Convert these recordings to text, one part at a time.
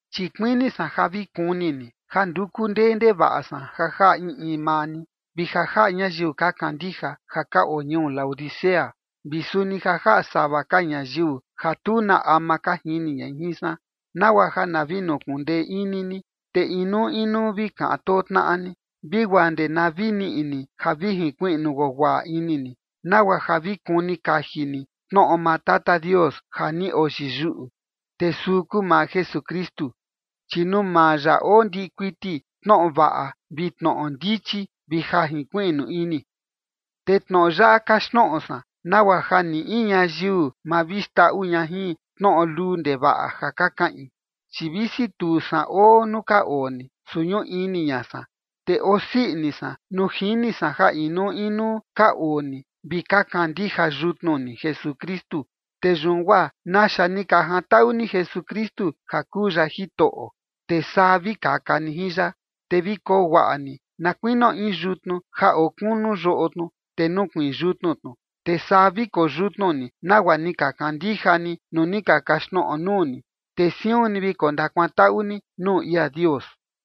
Chi kuini san ja vi kuni ni ja nduku ndee ndevaꞌa san ja jaꞌa in in maa ni, vi ja jaꞌa ñayiu ka kandija ja ka oo ñuu Laodicea, vi suni ja jaꞌa sava ka ñayiu ja tu na ama ka jini ña jin san, nagua ja na vi nukundee ini ni, te inuu inuu vi kaꞌan too tnaꞌa ni, vi guaa ndee na vi niꞌi ni ja vi jinkuiꞌnu guaguaꞌa ini ni nagua ja vi kuni kaji ni tnoꞌo maa Tata Dios ja ni oyiyuꞌu, te suu kuu maa Jesukristu. Chi nuu maa ya oo ndiꞌi kuiti tnoꞌo vaꞌa vi tnoꞌo ndichi vi ja jinkuiꞌnu ini. Te tnoꞌo yaꞌa kaxtnoꞌo san nagua ja ni in ñayiu ma vi xndaꞌu ña jin tnoꞌo luu ndevaꞌa ja ka kaꞌin. Chi visi tu san oo nuu ka oo ni, su ñuꞌu ini ña san, te oo sii ini san nuu jini san ja inuu inuu ka oo ni vi ka kandija yutnu ni Jesukristu. Te yun guaa naxa ni ka jantaꞌu ni Jesukristu ja kuu ya Jitoꞌo, te saa vi kaka ni jin ya. Te vi koo guaꞌa ni na kuinio in yutnu ja oo kunu yoꞌo tnu, te nukuiin yutnu tnu, te saa vi koyutnu ni nagua ni ka kandija ni nuu ni ka kaxtnoꞌo nuu ni, te siun ni vi kondakuantaꞌu ni nuu ia Dios.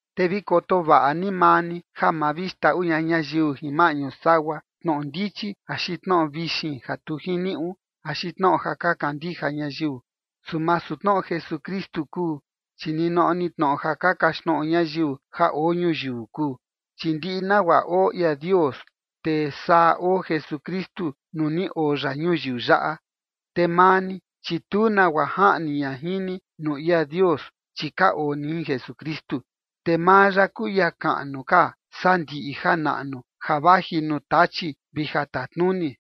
Te vi koto vaꞌa ni maa ni ja ma vi xndaꞌu ña ñayiu jin maꞌñu sagua tnoꞌo ndichi axi tnoꞌo vixin ja tu jiniuꞌu, axi tnoꞌo ja ka kandija ñayiu, su masu tnoꞌo Jesukristu kuu, chi ninoꞌo ni tnoꞌo ja ka kaxtnoꞌo ñayiu ja oo ñuyiu kuu. Chi ndiꞌi nagua oo ia Dios, te saa oo Jesukristu nuu ni oo ya ñuyiu yaꞌa. Te maa ni, chi tu nagua jaꞌni ña jin ni nuu ia Dios, chi ka oo ni jin Jesukristu, te maa ya kuu ia kaꞌnu ka saa ndiꞌi janaꞌnu ja vaji nuu Tachi vi jatatnuni.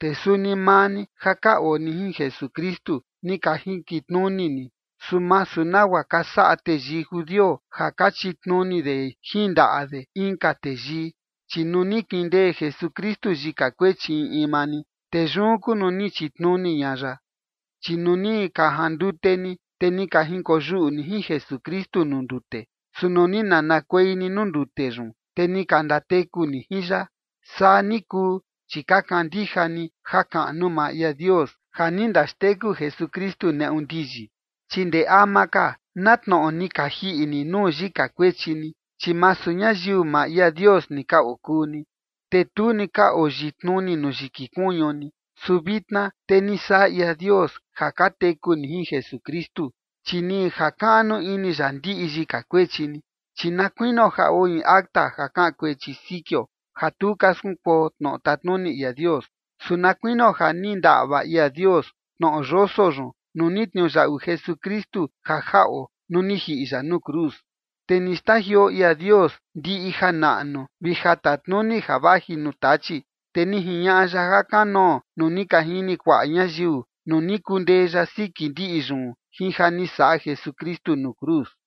Te suni maa ni ja ka oo ni jin Jesukristu, ni ka jinkitnuni ni, su masu nagua ka saꞌa teyii judio ja ka chitnuni de jin ndaꞌa de inka teyii, chi nuu ni kindee Jesukristu yika kuechi in in maa ni, te yun kuu nuu ni chitnuni ña ya. Chi nuu ni ka jandute ni, te ni ka jinkoyuꞌu ni jin Jesukristu nuu ndute. Su nuu ni nanakuei ni nuu ndute yun, te ni ka ndateku ni jin ya. Saa ni kuu, chi ka kandija ni jakaꞌnu maa ia Dios ja ni ndaxteku Jesukristu neꞌu ndiyi. Chi ndee ama ka na tnoꞌo ni ka jiꞌi ni nuu yika kuechi ni, chi masu ñayiu maa ia Dios ni ka okuu ni, te tu ni ka oyitnuni nuu yiki kuñu ni, su vitna te ni saꞌa ia Dios ja ka teku ni jin Jesukristu, chi ni jakaꞌnu ini ya ndiꞌi yika kuechi ni. Chi na kuinio ja oo in acta ja kaꞌan kuechi sikio ja tu ka skunkuo tnoꞌo tatnuni ia Dios, su na kuinio ja ni ndaꞌva ia Dios tnoꞌo yoso yun nuu ni tniuyaꞌu Jesukristu ja jaꞌo nuu ni jiꞌi ya nuu cruz. Te ni xtajioo ia Dios ndiꞌi janaꞌnu vi jatatnuni ja vaji nuu Tachi, te ni jiñaꞌa ya jakanoo nuu ni ka jini kuaꞌa ñayiu nuu ni kundee ya siki ndiꞌi yun jin ja ni saꞌa Jesukristu nuu cruz.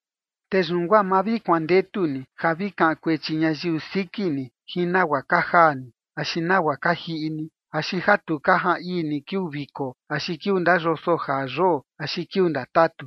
Te yun guaa ma vi kuandetu ni ja vi kaꞌan kuechi ñayiu siki ni jin nagua ka jaa ni axi nagua ka jiꞌi ni axi ja tu ka jaan ii ni kiuu viko axi kiuu ndayoso jaa yoo axi kiuu ndatatu.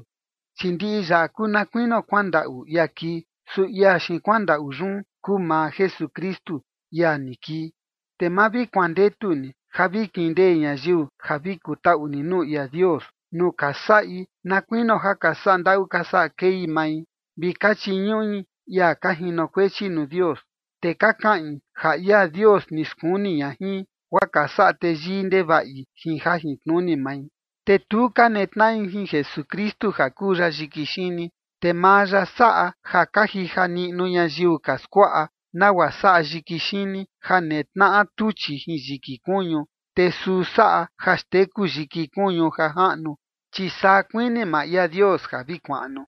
Chi ndiꞌi yaꞌa kuu na kuinio kuandaꞌu ia kii, su ia xiin kuandaꞌu yun kuu maa Jesukristu, ia ni kii. Te ma vi kuandetu ni ja vi kindee ñayiu ja vi kutaꞌu ni nuu ia Dios, nuu ka saꞌi na kuinio ja ka saꞌa ndaꞌu ka saꞌa kei mai vi ka chiñuꞌi ia ka jinokuechi nuu Dios. Te ka kaꞌin ja ia Dios ni skuni ña jin, guaa ka saꞌa teyii ndevaꞌi jin jajintnuni mai. Te tu ka netnaꞌi jin Jesukristu ja kuu ya yiki xini, te maa ya saꞌa ja ka jija niꞌnu ñayiu ka skuaꞌa nagua saꞌa yiki xini ja netnaꞌa tuchi jin yiki kuñu, te suu saꞌa ja xteku yiki kuñu ja jaꞌnu, chi saa kuini maa ia Dios ja vi kuaꞌnu.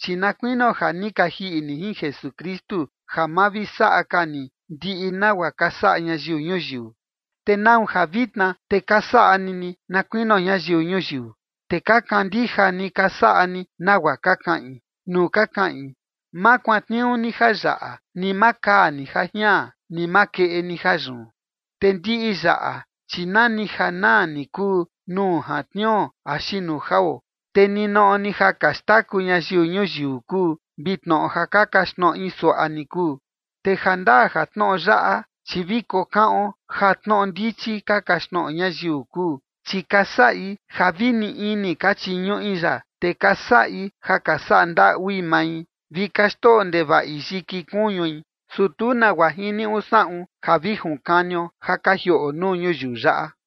Chi na kuinio ja ni ka jiꞌi ni jin Jesukristu ja ma vi saꞌa ka ni ndiꞌi nagua ka saꞌa ñayiu ñuyiu. ¿Te nau ja vitna te ka saꞌa ni ni na kuinio ñayiu ñuyiu, te ka kandija ni ka saꞌa ni nagua ka kaꞌin nuu ka kaꞌin: “Ma kuantniuu ni jayaꞌa, ni ma kaa ni jajian, ni ma keꞌe ni jayun”? Te ndiꞌi yaꞌa, chi nani ja naa ni kuu nuu jantniuo axi nuu jao, te ninoꞌo ni ja ka xtaku ñayiu ñuyiu kuu vi tnoꞌo ja ka kaxtnoꞌi suaꞌa ni kuu. Te jandaa ja tnoꞌo yaꞌa, chi vi kokaꞌon ja tnoꞌo ndichi ka kaxtnoꞌo ñayiu kuu, chi ka saꞌi ja vi nii ini ka chiñuꞌi ya, te ka saꞌi ja ka saꞌa ndaꞌui mai, vi ka xndoꞌo ndevaꞌi yiki kuñui, su tu nagua jiniuꞌu saꞌun ja vi junkanio ja ka jioꞌo nuu ñuyiu yaꞌa.